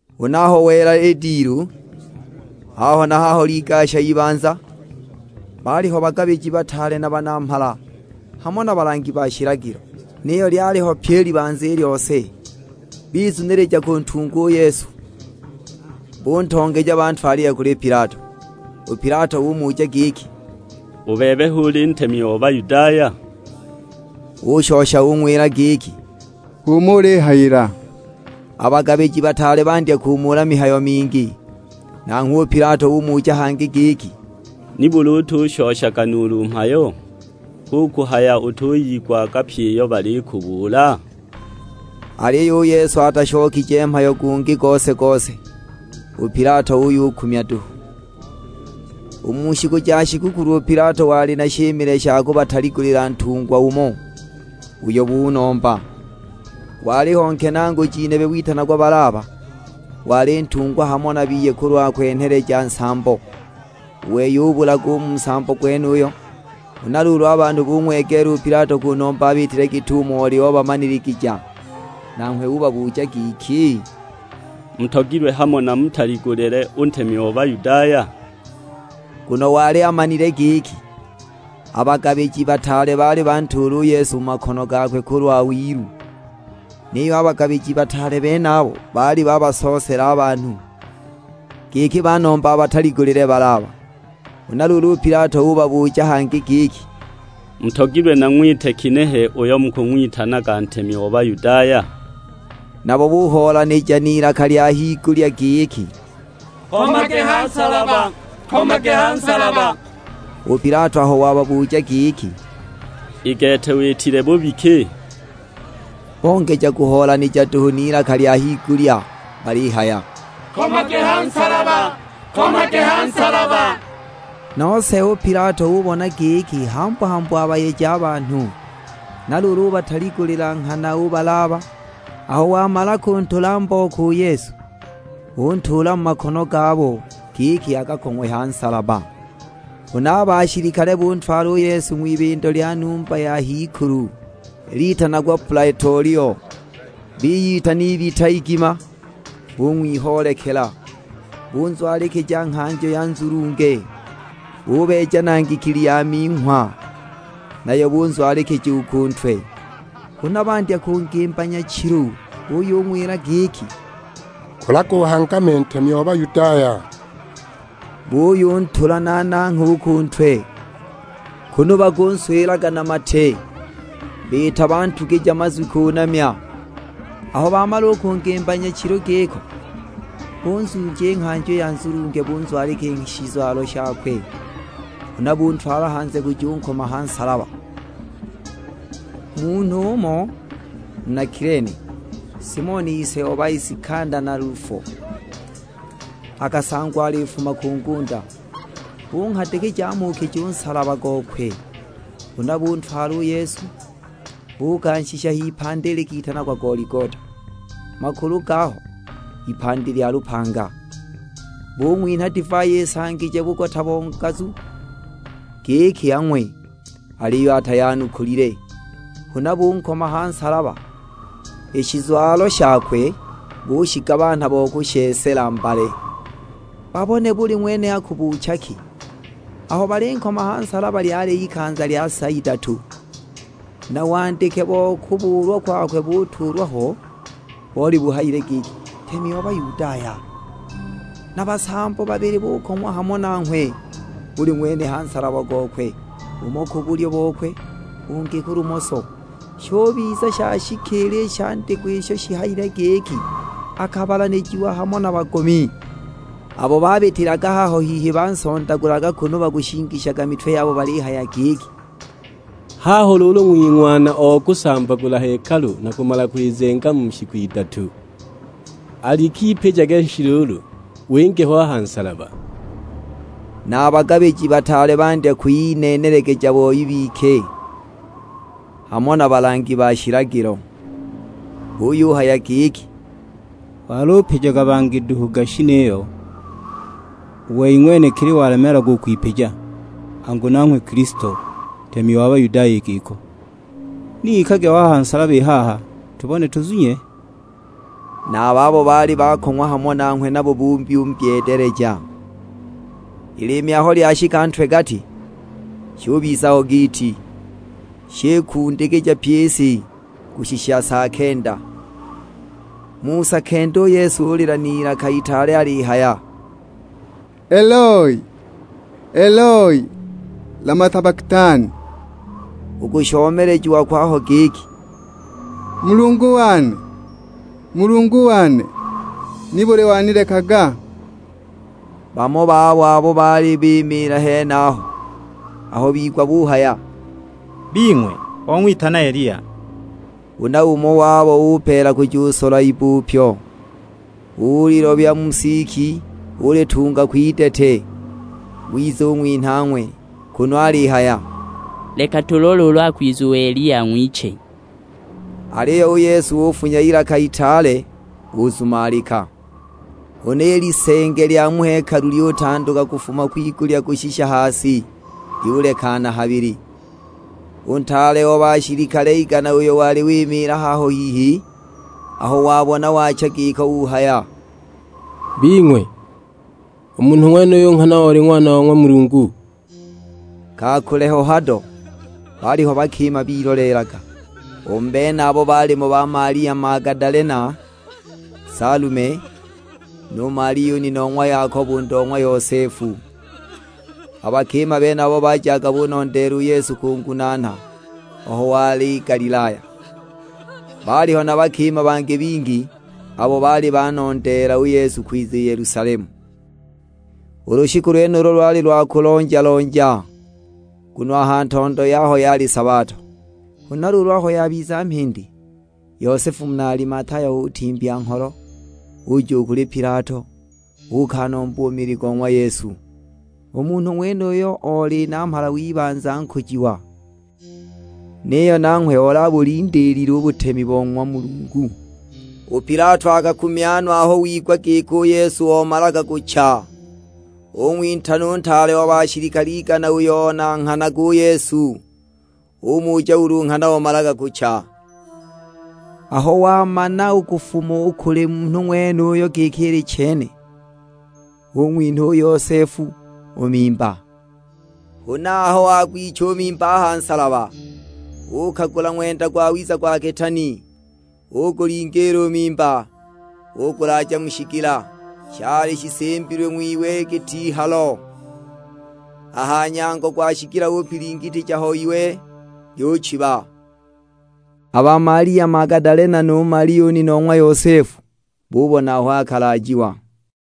Huna aho wela i dilu, haho na haho ligasha ibanza: baaliho bagabiji bataale na banamhala, hamo na balangi ba shilagilo, niyo lyaliho pyi i libanza i lyose; bizunilija kuntunga u Yesu. Buntongeja bantwalile kuli Pilato. U Pilato umuja giki, "U bebe hu uli ntemi o Bayudaya?" Ushosha ung'wila giki, "H'umo ulihayila!" A bagabiji bataale bandya kumuula mihayo mingi. Nanghwe u Pilato umuja hangi giki, "Nibuli utushoshaga nuulu mhayo? Hu kuhaya utuyigwaga pyi iyo balikubuula?" Aliyo u Yesu atashokije mhayo gungi gose-gose, u Pilato uyukumya duhu! U mu shiku ja shigukulu u Pilato wali na shimile sha kubataligulila ntungwa umo, uyo bunomba. Waliho nkenaaguji nebe, witanagwa Balaba, wali watungwa hamo na biye kulwa kwenheleja nsambo; u wei ubulaga u mu nsambo gwenuyo. Huna luulu a banhu bung'wegeela u Pilato kunomba abiitile git'umo oli obamaniligija. Nanghwe ubabuja giki, "Mutogilwe hamo namutaligulile u ntemi o Bayudaya?" Nguno wali amanile giki, a bagabiji bataale baali bantuula u Yesu mu makono gakwe kulwa wilu. Niyo a bagabiji bataale benabo baali babasoosela a banhu, giki banombe abataligulile Balaba. Huna luulu u Pilato ubabuja hangi giki, "Mutogilwe nang'wite ginehe uyo mukung'witanaga ntemi o Bayudaya?" Nabo buhoolanija n'ilaka lya higulya giki, "Nkomage ha nsalaba!" U Pilato aho wababuja giki, "I gete witile bubi ki?" Bongeja kuhoolanija duhu n'ilaka lya higulya balihaya, "Nkomage ha nsalaba!" Nose u Pilato ubona giki hambu-hambu abayeje a banhu, na luulu ubataligulila nghana u Balaba. Aho wamala kuntula mbooko u Yesu, untuula mu makono gabo, giki akakong'we ha nsalaba. Huna a bashilikale buntwala u Yesu ng'wibindo lya numba ya h'ikulu (litanagwa plaetolio), biyitana ibita igima, bung'wihoolekela. Bunzwalikija nghanjo ya nzulunge. Bubeeja na ngikili ya minghwa, nayo bunzwalikija u ku ntwe. Huna bandya kungimba nyachilu, buyung'wila giki, "Kulaga uhangame ntemi o Bayudaya!" Buyuntula na nangha u ku ntwe, kunu bakunswilaga na mate, biita bantugija mazwi kunamya! Aho bamala u kungimba nyachilu giko, bunzuuja i nghanjo i ya nzulunge bunzwalikija i shizwalo shakwe, huna buntwala hanze kujunkoma ha nsalaba! Munhu umo, muna Kilene, Simoni ise o ba Isikanda na Lufo, akasangwa alifuma ku ngunda, bunghadikija amuukije u nsalaba gokwe. Huna buntwala u Yesu, buukanshisha h'ipandi likitanagwa Goligota, (makulu gaho, "Ipandi lya lupanga.") Bung'winha divai isangije bugota bo ngazu, giki ang'we; aliyo atayanukulile. Huna bunkoma ha nsalaba, i shizwalo shakwe bushigabanha bo kushesela mbale, babone buli ng'wene akubuucha ki! Aho balinkoma ha nsalaba lyali ikanza lya sa idatu. Na wandike bo kubuulwa kwakwe butuulwa ho, boli buhayile giki, "NTEMI O BAYUDAYA." Na basambo babili bukong'wa hamo nanghwe, buli ng'wene ha nsalaba gokwe, umo ku bulyo bokwe, ungi ku lumoso. [ Shubiza shashikiila i shandikwa isho shihayile giki, "Akabalanijiwa hamo na bagomi."] Abo babitilaga haho hihi bansondagulaga kunu bakushingishaga mitwe yabo balihaya giki, "Haho luulu ng'wing'wana o kusambagula hekalu na kumala kwizenga mu shiku idatu. Alik'ipijage shi luulu, winge ho a ha nsalaba!" Na a bagabiji bataale bandya kwiyineenelegeja boi bike, hamo na balangi ba shilagilo. Buyuhaya giki, "Walupijaga bangi duhu gashi niyo, u wei ng'wenekili walemeelagwa u kwipija! Angu nanghwe Kilisto, ntemi wa Bayudaya i giko, ni ikage ho a ha nsalaba i haha, tubone tuzunye!" Na a babo baali bakong'wa hamo nanghwe nabo buyumbyeedeleja! I liimi aho lyashika ntwe-gati, shubiza ho giiti; shikundikija pyi i si, kushisha sa kenda. Mu sa kenda u Yesu ulila n'ilaka itaale alihaya, "Eloi, Eloi, lama sabaktani?" U kushomelejiwa kwaho giki, "Mulungu wane, Mulungu wane, nibuli wanilekaga?" Bamo babo abo baali bimiila henaho aho bigwa buhaya, "Bing'we, ong'witana Eliya!" Huna umo wabo upeela kujusola ibbupyo, ulilobya mu siki ulitunga kwidete, wiza ung'winha ang'we; kunu alihaya, "Leka tulole ulu akwiza u Eliya ang'wiche!" Aliyo u Yesu ufunya ilaka itaale, uzumalika! Huna i lisenge lya mu hekalu lyutanduka kufuma kwigulya kushisha ha si, lyulekana habili. U ntaale o bashilikale igana, uyo oli wimiila haho hihi, aho wabona waacha giko uhaya; "Bing'we, u munhu ng'wenuyu nghana oli Ng'wana wa ng'wa Mulungu!" Ka kule ho hado, baaliho bakima biloleelaga. U mu benabo baalimo ba Malia Magadalena, Salume, nu Malia u nina o ng'wa Yakobo u ndo na Yosefu. A bakima benabo bajaga bunondeela u Yesu kungunaana aho wali Galilaya. Baaliho na bakima bangi bingi, abo baali banondeela u Yesu kwiza i Yelusalemu. U lushiku lwenulo lwali lwa kulonja-lonja, nguno a ha ntondo yaho yali sabato. Huna luulu aho yabiza mhindi, Yosefu, muna Alimataya utimbya ngholo, uja u kuli Pilato, uukanomba u mili go ng'wa Yesu. U munhu ng'wenuyo oli namhala w'ibanza nkujiwa, niyo nanghwe ol'abulindiilile u butemi bo ng'wa Mulungu. U Pilato akakumya aho wigwa giki u Yesu omalaga kucha. Ung'witana u ntaale o bashilikale igana uyo onanghanaga u Yesu, umuja ulu nghana omalaga kucha. Aho wamana u kufuma u kuli munhu ng'wenuyo giki ili chene, ung'winha u Yosefu u mimba. Huna aho wagwicha u mimba a ha nsalaba, uukagula ng'wenda gwawiza gwa kitaani, ugulingiila u mimba, ugulaaja mu shigila, shali shisimbilwe ng'wiwe git'ihalo. A ha nyango gwa shigila upilingitija ho iwe, lyuchiba. A ba Malia Magadalena nu Malia u nina o ng'wa Yosefu, bubona aho akalaajiwa.